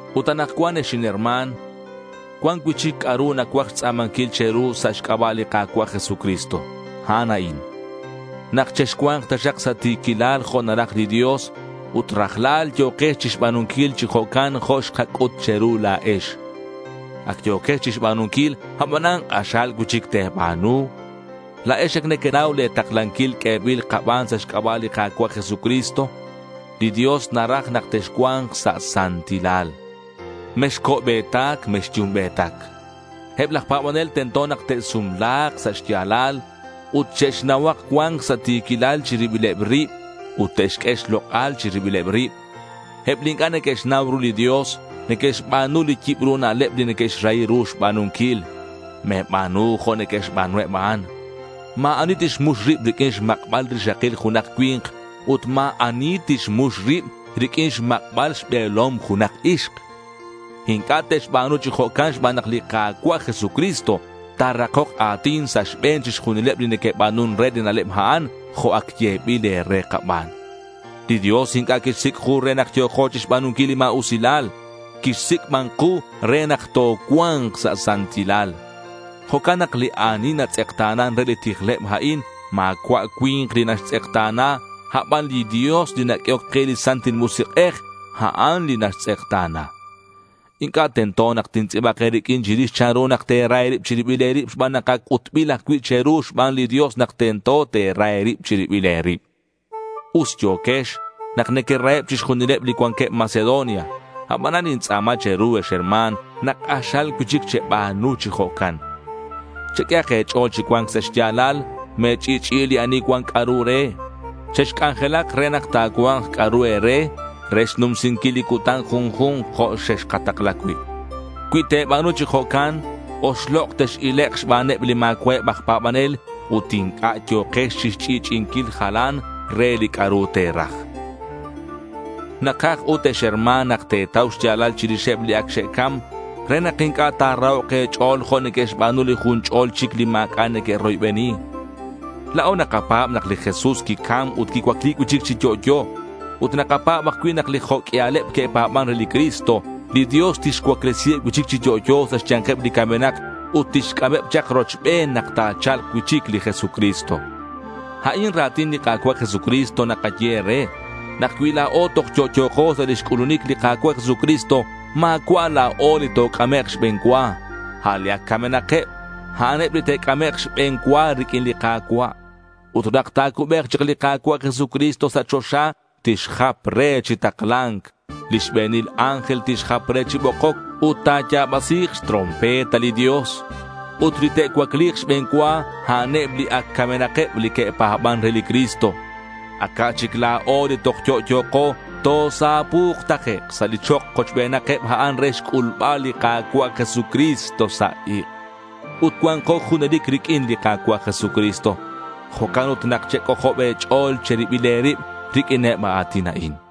Ut anakcuan ex inherma̱n, cuan cui'chic c'a'ru nacuaj xtz'a̱manquil che̱ru sa' xc'aba' li Ka̱cua' Jesucristo. A'an a'in: nak chexcua̱nk taxak sa' ti̱quilal jo' naraj li Dios ut rajlal yo̱kex chixba̱nunquil chi jo'can jo' xkac'ut che̱ru la̱o. Ac yo̱quex chixba̱nunquil, abanan k'axal cui'chic te̱ba̱nu. La̱ex ac nequenau le̱ taklanquil q'uebil kaban sa' xc'aba' li Ka̱cua' Jesucristo. Li Dios naraj nak texcua̱nk sa' santilal. Mexco'be̱tac mexyumbe̱tac. Eb laj pa̱banel tento nak te'sumla̱k sa' xya̱lal ut che'xnauhak cua̱nc sa' ti̱quilal chi ribileb rib ut te'xq'ue xlok'al chi ribileb rib. Eb li inc'a' neque'xnau ru li Dios, neque'xba̱nu li yibru na'leb li neque'xrahi ru xba̱nunquil. Me̱ba̱nu jo' neque'xba̱nu eb a'an. Ma̱ ani tixmux rib riq'uin xmak'bal rixakil junak cui̱nk ut ma̱ ani tixmux rib riq'uin xmak'bal xbe̱lom junak ixk. Inc'a' te'xba̱nu chi jo'can xban nak li Ka̱cua' Jesucristo ta̱rakok a̱tin sa' xbe̱n chixjunileb li neque'ba̱nun re li na'leb a'an, jo' ac yebil e̱re kaban. Li Dios inc'a' quixsic' ku re nak yo̱ko chixba̱nunquil li ma̱usilal. Quixsic' ban ku re nak tocua̱nk sa' santilal. Jo'can nak li ani natz'ekta̱nan re li tijleb a'in, ma̱cua' cui̱nk li naxtz'ekta̱na. A' ban li Dios li naq'uehoc ke li Santil Musik'ej, a'an li naxtz'ekta̱na. Inc'a' tento nak tintz'i̱bak e̱riq'uin chirix chanru nak te̱ra e̱rib che̱ribil e̱rib xban nak ac c'utbil ajcui' che̱ru xban li Dios nak tento te̱ra e̱rib che̱ribil e̱rib. Us yo̱quex nak nequeraheb chixjunileb li cuanqueb Macedonia. Abanan nintz'a̱ma che̱ru, ex herma̱n, nak k'axal cui'chic cheba̱nu chi jo'can. Cheq'uehak e̱ch'o̱l chi cua̱nc sa' xya̱lal. Me̱ch'i'ch'i'i li ani cuan c'a'ru re. Chexc'anjelak re nak ta̱cua̱nk c'a'ru e̱re re xnumsinquil li cutan junju̱nk jo' xexkatakla cui'. Cui te̱ba̱nu chi jo'can, oxlok' tex-ilek' xbaneb li ma̱cua'eb aj pa̱banel, ut inc'a' yo̱kex chixch'i'ch'i'inquil jalan re li c'a'ru te̱raj. Nakaj ut ex herma̱n nak te̱tau xya̱lal chirixeb li ac xe'cam re nak inc'a' ta̱rahok' e̱ch'o̱l jo' neque'xba̱nu li jun ch'ol chic li ma̱c'a' neque'roybeni. La̱o nakapa̱b nak li Jesús quicam ut quicuacli cui'chic chi yo'yo. Ut nakapa̱b ajcui' nak li jo' q'uialeb que'pa̱ban re li Cristo, li Dios tixcuaclesiheb cui'chic chi yo'yo sa' xya̱nkeb li camenak ut tixc'ameb chak rochben nak ta̱cha̱lk cui'chic li Jesucristo. A'in ra̱tin li Ka̱cua' Jesucristo nakaye e̱re, nak cui la̱o toj yo'yo̱ko sa' lix c'ulunic li Ka̱cua' Jesucristo, ma̱cua' la̱o li toc'amek' xbe̱n cua. A' li ac camenakeb, a'an eb li te'c'amek' xbe̱n cua riq'uin li Ka̱cua'. Ut nak ta̱cubek chak li Ka̱cua' Jesucristo sa' choxa, tixjap re chi takla̱nc. Li xbe̱nil ángel tixjap re chi bokoc, ut ta̱ya̱basi̱k xtrompeta li Dios. Ut li te'cuacli̱k xbe̱n cua, a'aneb li ac camenakeb, li que'pa̱ban re li Cristo. Aca' chic la̱o li toj yo'yo̱ko tosapu̱k takec' sa' li chok kochbenakeb a'an re xc'ulbal li Ka̱cua' Jesucristo sa' ik'. Ut cua̱nko junelic riq'uin li Ka̱cua' Jesucristo. Jo'can ut nak chec'ojob e̱ch'o̱l che̱ribil e̱rib riq'uineb a a̱tin a'in.